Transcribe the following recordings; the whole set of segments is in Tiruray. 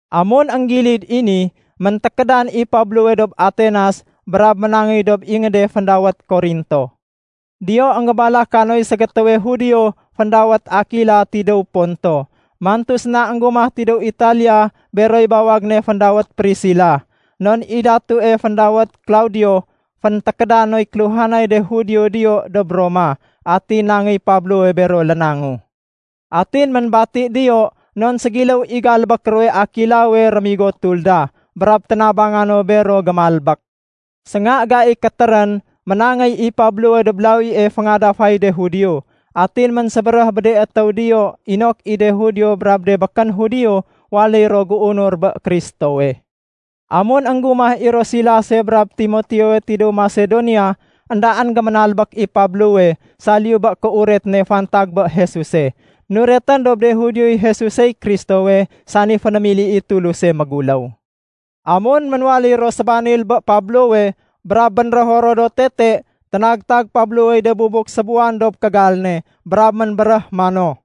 Amun énggilid i ni, méntékédan i Pablowe dob Atenas brab ménangéy dob ingéde féndawét Korinto. Diyo énggébalaka noy ségétéwe Judio féndawét Akila tidéw Ponto. Mantu séna énggumah tidéw Italia beroy bawag ne féndawét Prisila, non i datue féndawét Klaudio, féntékéda noy kéluhanay de Judio diyo dob Roma. Atin nangéy Pablowe bero lénangu. Atin ménbati diyo non ségiléw i galbék ruwe Akilawe rémigo tulda. Brab ténabanga no bero gémalbék. Sénga gai kétérén, ménangéy i Pablowe dob lawie féngadafay de Judio, atin ménsébéréh bé de étéw diyo inok i de Judio brab de békén Judio waléy ro géunur bé Kristowe. Amun énggumah i ro Silase brab Timoteowe tidéw Masedonia, éndaén géménalbék i Pablowe saliyu bé kéuret ne fantag bé Jesuse. Nuretén dob de Judioy Jesusey Kristowe, sani fénémili i Tuluse méguléw. Amun ménwaléy ro sébanil bé Pablowe brab bénrého ro do tete, ténagtag Pablowey de bubuk sébuwan dob kégal ne, brab ménbéréh mano,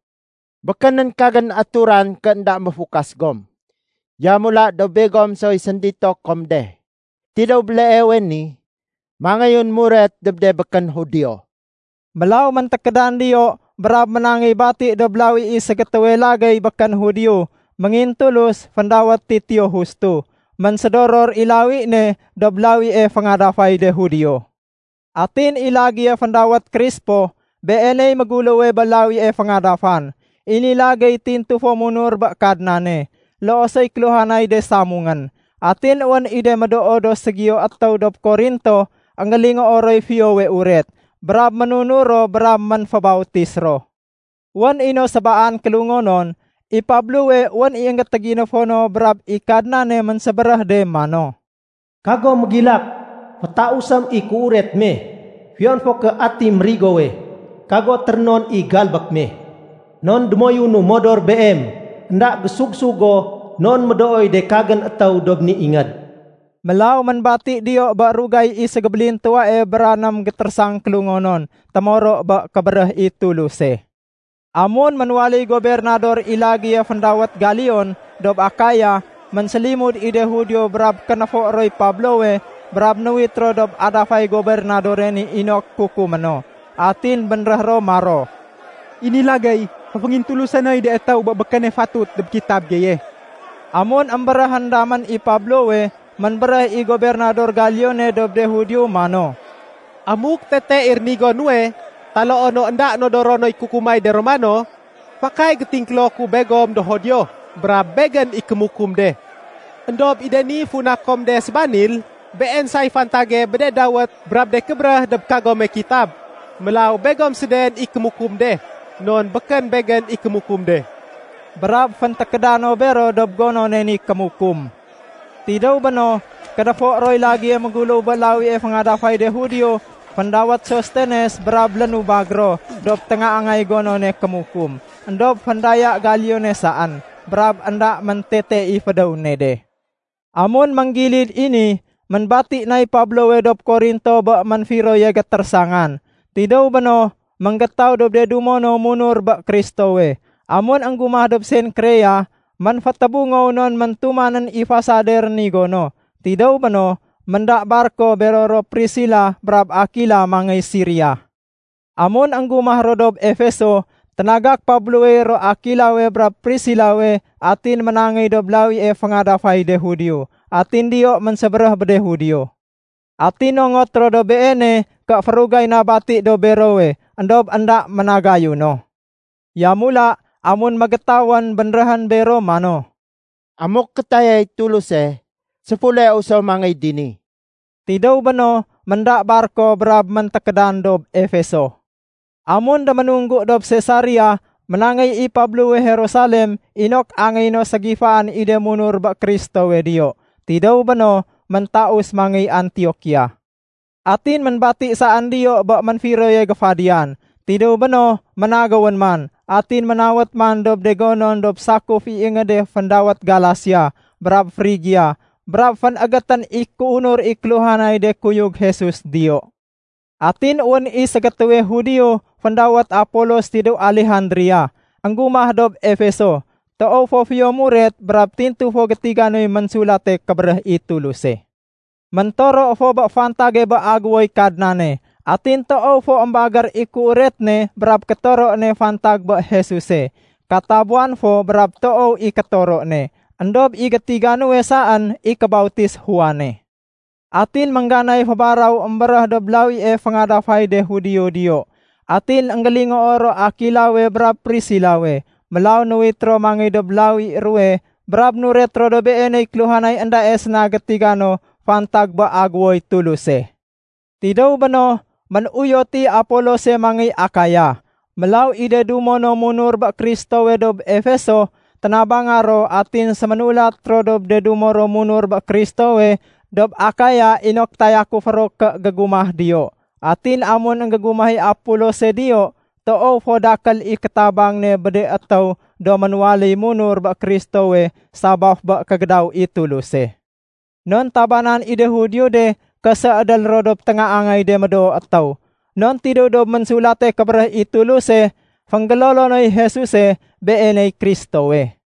“Békénén kagén aturan ké énda méfukas gom. Yamula do begom soy séndito kom de. Tidéw béleewe ni mangéyun muret dob de békén Judio.” Mélaw méntékédan diyo brab ménangéy bati dob lawi i ségétéwe lagéy békén Judio méngintulus féndawét Titio Justo. Ménsédoror i lawi ne dob lawie féngadafay de Judio. Atin i lagéye féndawét Krispo, beeney méguléwe bé lawie féngadafan. I ni lagéy tintu fo ménunur bé Kadnane, loo soy kéluhanay de samungén. Atin wén i de médoo do ségiyo étéw dob Korinto énggélingoo roy Fiyowe Uret, brab ménunur ro brab ménfébautis ro. Wén i no sébaan kélungonon, i Pablowe wén i énggétéginéfo no brab i Kadnane ménsébéréh de mano, “Kago mégilak! Fétausém i kéuret me. Fiyon fo ké ati mérigowe, kago térénon i galbék me. Non démoyunu modor beem. Enda gésug-sug go non médooy de kagén étéw dob ni ingéd.” Mélaw ménbati diyo bé rugay i ségébélintuwae bra ném gétérésang kélungonon témoro bé kébéréh i Tuluse. Amun ménwaléy gobernador i lagéye féndawét Galion dob Akaya, ménsélimud i de Judio brab kénéfo roy Pablowe brab nuwit ro dob adafay gobernadore ni inok kukumé no. Atin bénréh ro maro, “I ni lagéy, féféngintulusé noy de étéw bé békéne fatut dob kitab geye.” Amun émbéréhén damén i Pablowe, ménbéréh i gobernador Galione dob de Judio mano, “Amuk tete i rénigo nuwe taloo no énda nodoro noy kukumay de Romano, fakay gétingkélo ku begom do Judio brab begén i kémukum de. Endob i de ni funa kom de sébanil, been say fantage bé de dawét brab de kébéréh dob kagome kitab. Mélaw begom séden i kémukum de, non békén begén i kémukum de.” Brab féntékéda no bero dob gonone ni kémukum. Tidéw béno, kénéfo roy lagéye méguléw bé lawie féngadafay de Judio féndawét Sostenes brab lénubag ro dob téngaangay gonone kémukum. Endob féndaya Galione saén, brab énda méntete i fédéw ne de. Amun ménggilid i ni, ménbati nay Pablowe dob Korinto bé ménfiroye gétérésangan. Tidéw béno, ménggétaw dob de dumo no munur bé Kristowe. Amun énggumah dob Senkrea, ménfétébungow non méntumanén i fasade rénigo no. Tidéw béno, ménda barko bero ro Prisila brab Akila mangéy Siria. Amun énggumah ro dob Efeso, ténagak Pablowey ro Akilawe brab Prisilawe atin ménangéy dob lawie féngadafay de Judio. Atin diyo ménsébéréh bé de Judio. Atin nongot ro dob beene ké férugay na bati dob berowe. Endob énda ménagayu no. Yamula amun mégétawén, bénréhén bero mano, “Amuk kétayay Tuluse, séfuleu so mangéy dini.” Tidéw béno, ménda barko brab méntékédan dob Efeso. Amun déménunggu dob Sesaria ménangéy i Pablowe Jerusalem inok angéyé no ségifaén i de munur bé Kristowe diyo. Tidéw béno, méntaus mangéy Antiokia. Atin ménbati saén diyo bé ménfiroye géfadiyan. Tidéw béno ménagéwén man. Atin ménawét man dob de gonon dob sakuf i de ingéd féndawét Galasia brab Frigia brab fénégétén i kéunur i kéluhanay de kuyug Jesus diyo. Atin wén i ségétéwe Judio féndawét Apolos tidéw Alejandria, énggumah dob Efeso. Toow fo fiyo muret brab tintu fo gétiga noy Ménsulate Kébéréh i Tuluse. Méntoro fo bé fantage bé Agéwoy Kadnane. Atin toow fo émbagér i kéuret ne brab kétoro ne fantag bé Jesuse. Katabuwan fo brab toow i kétoro ne, éndob i gétiga nuwe saén i kébautis Juane. Atin méngganay fébaraw émbéréh dob lawie féngadafay de Judio diyo, atin énggélingoo ro Akilawe brab Prisilawe. Mélaw nuwit ro mangéy dob lawi ruwe brab nuret ro dob beeney kéluhanay éndae séna gétiga no fantag bé Agéwoy Tuluse. Tidéw béno, ménuyot i Apolose mangéy Akaya. Mélaw i de dumo no munur bé Kristowe dob Efeso, ténabanga ro atin séménulat ro dob de dumo ro munur bé Kristowe dob Akaya inok tayakufé ro ké gégumah diyo. Atin amun énggégumah i Apolose diyo, toow fo dakél i kétabang ne bé de étéw do ménwaléy munur bé Kristowe sabaf bé kégédaw i Tuluse. Non tabanan i de Judio de ké séédél ro dob téngaangay de médoo étéw. Non tidéw dob Ménsulate Kébéréh i Tuluse fénggélolo noy Jesuse, Beeney Kristowe.